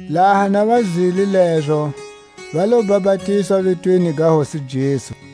Laha na va zwile lezo, va lo bapatizwa vitweni ga Hosi Jesu.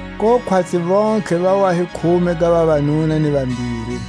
Ko khwatsi vontlhe va wa hi khume ga vavanuna ni vambiri.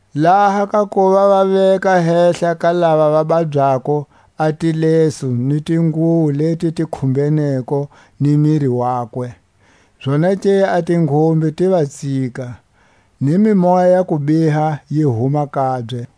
laha ka kuva va veka hehla ka lava va babyako a tilesu ni tinguwo leti ti khumbeneko ni miri wakwe, zonake a tinghumbe ti va tsika, ni mimoya ya kubiha yi huma kabye.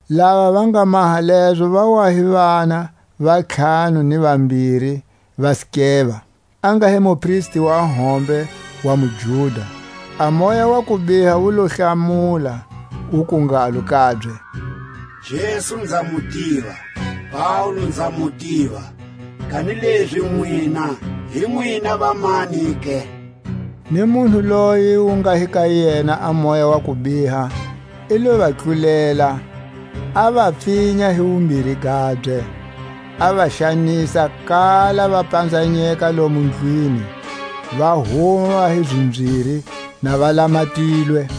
Lava va nga maha lezo va wa hi vana va ntlhanu ni vambiri va Skeva, a nga hi mupristi wa hombe wa muJuda. A moya wa kubiha wu lo hlamula wuku ngalo kabye: Jesu nza mu tiva, na Paule nza mu tiva; kanilezi nwina hi nwina vamani ke? Ni munhu loyi wu nga hi ka yena a moya wa kubiha i lo va tlulela, a va pfinya hi wumbiri gabye a va xanisa, kala va panzanyeka lomo ndlwini, va huma va hi zimbyiri na va lamatilwe.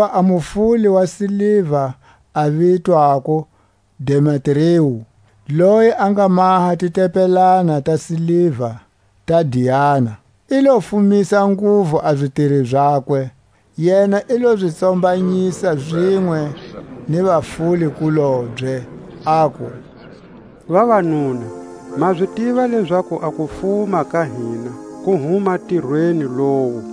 Hakuva a mufuli wa siliva, a vitwako Demetriu, loyi a nga maha titempelana ta siliva ta Diana, i lo fumisa nguvu a zitiri zakwe. Yena i lo zi tsombanyisa, zinwe ni vafuli-kulobye, aku: Vavanuna, ma zi tiva lezaku a kufuma ka hina ku huma ntirweni lowu.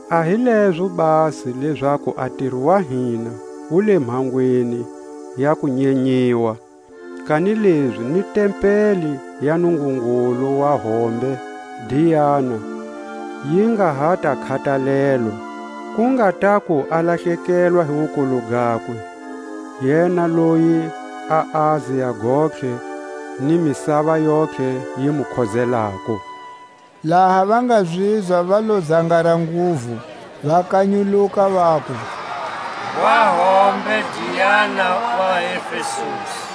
A hi lezo basi lezaku a ntiro wa hina wu le mhangweni ya ku nyenyiwa, kanilezi ni tempeli ya nungungulu wa hombe Diana yi nga ha ta khatalelwa, ku nga taku a lahlekelwa hi wukulu gakwe, yena loyi a Asia gontlhe ni misava yontlhe yi mu khozelako. Laha va nga zizwa va lo zangara nguvu, va kanyuluka, vaku: Ngwa hombe Diana wa vaEfesusi!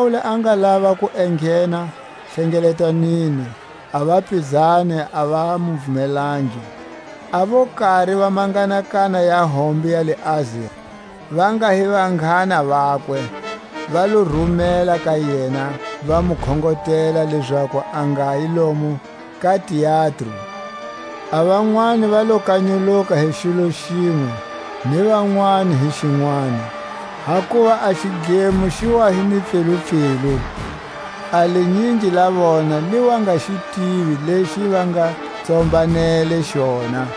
Laha Paule a nga lava ku enghena hlengeletanweni, a vapizani a va mu vumelangi. A vo kari va manghanakana ya hombe ya le Asia, va nga hi vanghana vakwe, va lo rumela ka yena, va mu khongotela lezaku a ngayi lomo ka teatro. A vanwani va lo kanyuluka hi xilo xinwe, ni vanwani hi xinwani; hakuva a xidlemo xi wa hi ni pfilupfilu; a linyingi la vona li wa nga xi tivi lexi va nga tsombanele xona.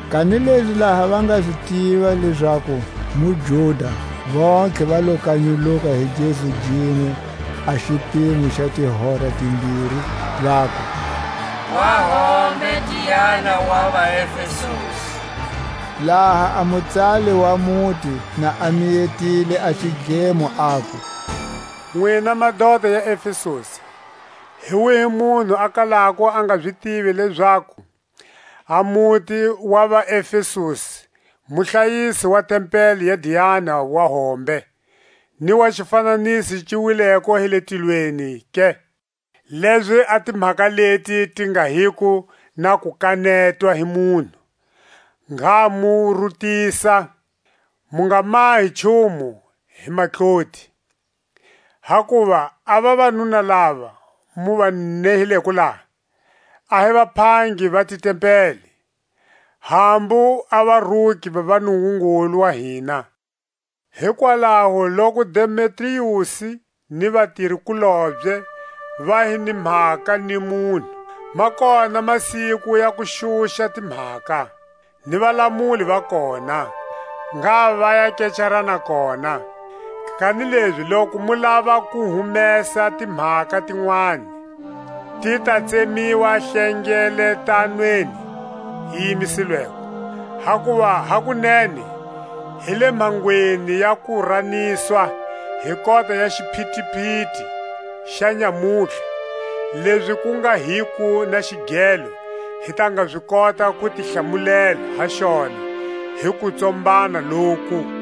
Kanilezi laha va nga zi tiva lezaku muJuda, vontlhe va lo kanyuluka hi gezu ginwe a xipimo xa tihora timbiri, vaku: Ngwa hombe Diana wa vaEfesusi! Laha a mutsali wa muti na a miyetile a xidlemo, aku: Nwina madota ya Efesusi, hi wihi munhu a kalako a nga zi tivi lezaku a muti wa vaEfesusi muhlayisi wa tempeli ya Diana wa hombe, ni wa xifananiso xi wileko hi le tilweni ke? Lezi a timhaka leti ti nga hiko na ku kanetwa hi munhu, ngha mu rutisa, mu nga mahi nchumu hi matloti. Hakuva a vavanuna lava mu va nehileko laha, a hi vaphangi va titempeli, hambu a varuki va nungungulu wa hina. Hikwalaho loku Demetriusi ni vatiri-kulobye va hi ni mhaka ni munhu, ma kona masiku ya ku xuxa timhaka, ni Valamuli va kona, ngha va ya kecarana kona. Kanilezi loku mu lava ku humesa timhaka tinwani, ti ta tsemiwa hlengeletanweni yi yimisilweko. Hakuva hakunene hi le mhangweni ya ku raniswa hi kota ya xiphitiphiti xa nyamutlha, lezi ku nga hiko na xigelo hi ta nga zi kota ku ti hlamulela ha xona hi kutsombana loku.